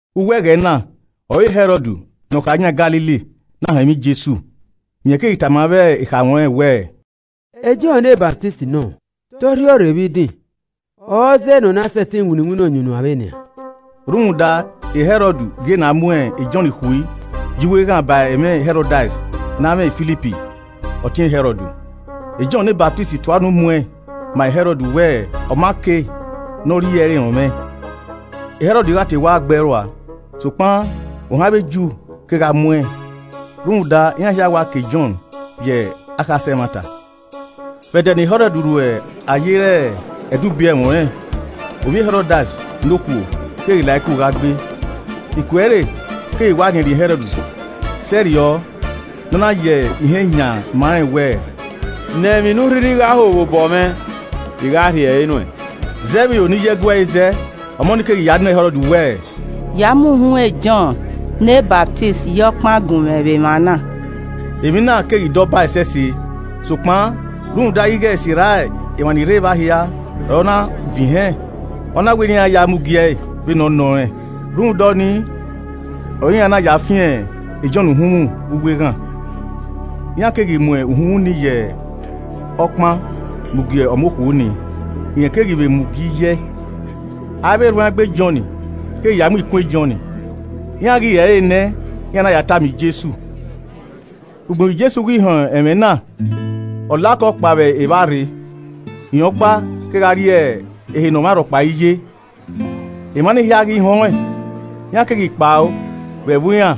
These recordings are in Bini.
Uwu ẹghẹ na ọre Hẹrọd ne ọ kha yan Galili na họn ẹmwẹ Jesu. Rẹn keghi tama avbe ekhaẹmwẹ ọnrẹn wẹẹ, “E Jọn ne Ọsamẹ nọ, te ọ rhiọrre vbe idin, ọre ọ zẹe ne ọ na sẹtin winna iwinna ọyunnuan vbenian.” Rhunmwuda, Hẹrọd gie ne a mu e Jọn khui ye uwu eghan ba ẹmwẹ Hẹrodias ne amwẹ Filip ọtẹn e Hẹrọd. Jọn ne Ọsamẹ tua unu muẹn ma Hẹrọd wẹ ọ ma kei ne ọ rhie ẹre rọnmwẹ. Hẹrọd gha te wa gbe ẹe rua, sokpan ohan avbe Ju kegha muẹn rhunmwuda iran hia wa ka e Jọn ye akhasẹ ẹmwata. Vbe ẹdẹ ne Hẹrọd ru ayere ẹdẹ ubiẹmwẹ ọnrẹn, ovbi e Hẹrodias ne okhuo keghi la iku gha gbee, iku ẹre keghi wa rhiẹnrhiẹn Hẹrọd sẹrriọ ne ọ na ya ihen yan ma rẹn wẹẹ, “Nọ emwi ne u rhirhi gha ho vbe obọ mwẹ, I gha rhie ẹre nuẹn.” Zẹ vbe iro ne iye ẹe gu ẹe zẹ, ọmọ ni keghi ya nọ e Hẹrọd wẹẹ, “Ya mu uhunmwu e Jọn ne Ọsamẹ ye ọkpan gunmwẹ vbe emwa na.” Emwi na keghi da ọba ẹsẹse sokpan rhunmwuda ighe sirra emwa ni rre evba hia ọre ọ na vẹn ihẹn, ọ na wẹ ne iran ya mu gi ẹe vbene ọ nọ rẹn. Rhunmwuda ọnii ọre iran na ya fian e Jọn uhunmwu vbe uwu eghan. Iran keghi mu uhunmwu ni ye ọkpan mu gie ọmọ okhuo ni, rẹn keghi vbe mu gie iye ẹe. Avbe erhuanegbe Jọn keghi ya mu ikun e Jọn, iran ghi re ẹre nẹ, iran na ya tama Jesu. Ugbẹn vbe Jesu ghi họn ẹmwẹ na, ọ la okọ kpao vbe evba rre, rẹn ọkpa kegha rrie ehe ne ọmwa rhọkpa i ye. Emwa nii hia ghi họn ẹn iran keghi kpao vbe ẹvbo iran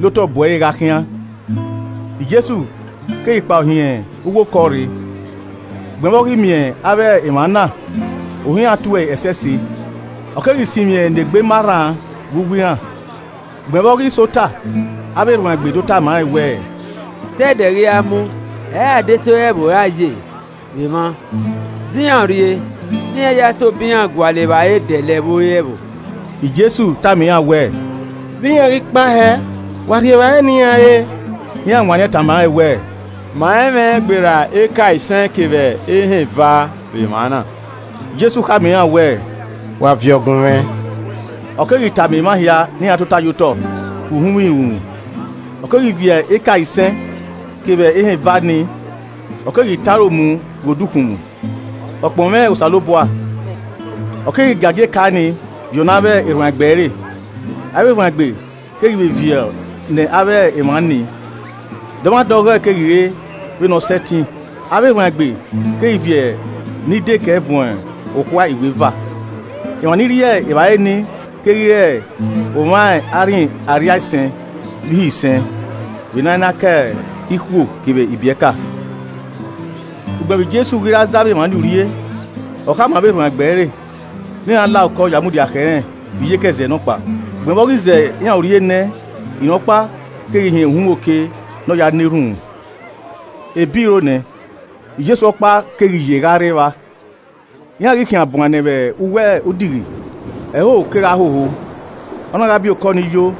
la otọ bu ẹre gha khian. Jesu keghi kpao hin uwu okọ rre, ugbẹn vbe ọ ghi miẹn avbe emwa na, ohan iran to ẹe ẹsẹse, ọ keghi sinmwi ne egbe ma rran vbe uwu iran. Ugbẹn vbe ọ ghi sẹ ota, avbe erhuanegbe do tama rẹn wẹẹ, “Te ẹdẹ ghi ra mu, ẹ i re adesẹ ẹvbo ọre a ye vbe emwa, zẹ iran urrie ne iran ya tobọ iran gualọ evbare dẹlẹ vbe ore ẹvbo.” Jesu tama iran wẹẹ, “Vbe iran ghi kpao hẹẹ, wa rhie evbare ne iran re.” Iran wanniẹn tama rẹn wẹẹ, “Ma i mwẹ gberra eka isẹn kevbe ehẹn eva vbe emwa na.” Jesu khama iran wẹẹ, “Wa viọ gunmwẹ.” Ọ keghi tama emwa hia ne iran tota ye otọ vbe uhunmwu irunmwu, ọ keghi viọ eka isẹn kevbe ehẹn eva nii, ọ keghi tọn aro mu ghe odukhunmwu, ọ kpọnmwẹ Osanobua ọ keghi giagia eka ni viọ ne avbe erhuanegbe ẹre, avbe erhuanegbe keghi vbe viọ ne avbe emwa nii. Dọmwadẹ ọghọe keghi re vbene ọ sẹtin. Avbe erhuanegbe keghi viọ ni dekẹe vuọn okhuae iweva. Emwa ni rri evbare ni keghi re omwa arhin arriaisẹn vbe ihe isẹn vbe ne a i na ka ikhuo kevbe ibiẹka. Ugbẹn vbe Jesu ghi ra zẹ avbe emwa ni urrie, ọ khama avbe erhuanegbe ẹre ne iran la okọ ya mudia khẹ irẹn vbe iyeke ẹzẹ nọkpa. Ugbẹn vbe ọ ghi zẹ iran urrie nẹ, rẹn ọkpa keghi hin uhunmwu oke ne ọ ya na erhunmwu. Ebi ro nẹ, Jesu ọkpa keghi ye gha rre evba. Iran ghi khian buan nẹ vbe uwu odighi, ẹhoho kegha hoho, ọ na gha bi okọ yo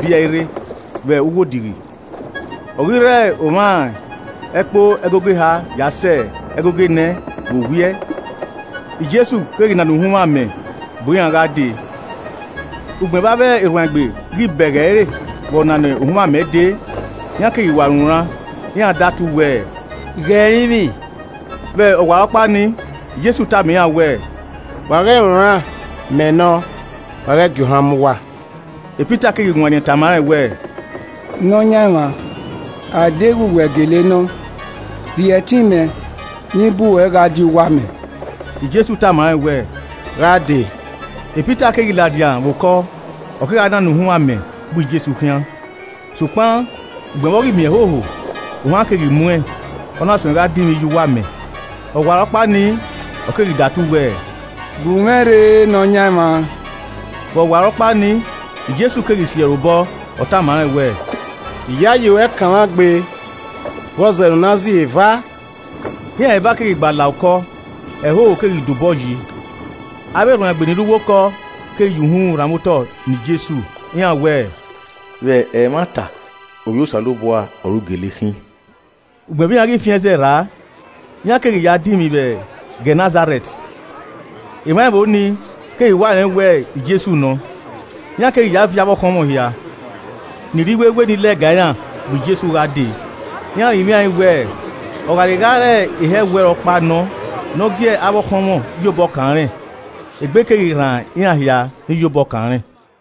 bi ẹe rre vbe uwu odighi. Ọ ghi rre omwa ẹkpo ẹgogo eha ya sẹ ẹgogo enẹ vbe owiẹ, Jesu keghi nana uhunmwu amẹ bu iran gha dee. Ugbẹn vbe avbe erhuanegbe ghi bẹghe ẹre vbe ọ nana uhunmwu amẹ dee, iran keghi wa runran. Iran da tu wẹẹ, “Ghe ẹrinmwi.” Vbe ọwarọkpa ni, Jesu tama iran wẹẹ, “Wa ghẹ runran Mẹ nọ. Wa ghẹ gie ohan mu uwa!” Pita keghi wanniẹn tama rẹn wẹẹ, “Nọyaẹnmwa, a deghẹ wẹ gele nọ, rhie ẹtin mẹ ne i bu ruẹ gha die uwu amẹ.” Jesu tama rẹn wẹẹ, “Gha dee.” Pita keghi ladian vbe okọ, ọ kegha nana uhunmwu amẹ bu Jesu khian. Sokpan ugbẹn vbe ọ ghi miẹn ẹhoho, ohan keghi muẹn ọ na suẹn gha dinmwi ye uwu amẹ. Ọwarọkpa nii, ọ keghi datu wẹẹ, “Bu mwẹ rre Nọyaẹnmwa.” Vbe ọwarọkpa nii, Jesu keghi si ẹre obọ, ọ tama rẹn wẹẹ, “Iyayi ruẹ kanmwa gbe, vbọzẹ ne u na ziro eva?” Iran eva keghi gba la okọ, ẹhoho keghi da obọ yi. Avbe, erhuanegbe ni rre uwu okọ keghi ya uhunmwu rhanmwẹ otọ ne Jesu, iran wẹẹ, “Vbe ẹmwata, Ovbi Osanobua ọre u gele khin.” Ugbẹn vbe iran ghi fian ẹzẹ rraa, iran keghi ya dunmwu vbe Gẹnẹsarẹt. Emwa ẹvbo ni keghi wa rẹn wẹ Jesu nọ, iran keghi ya viọ avbe ọkhọnmwọ hia ni rre iwewe ni lẹga iran bu Jesu gha dee. Iran rinmwiaẹn wẹẹ, ọ gha rhe gha re ehọ ẹwu ẹre ọkpa nọ ne ọ gie avbe ọkhọnmwọ ya obọ kan rẹn. Egbe keghi rran iran hia ni ya obọ kan rẹn.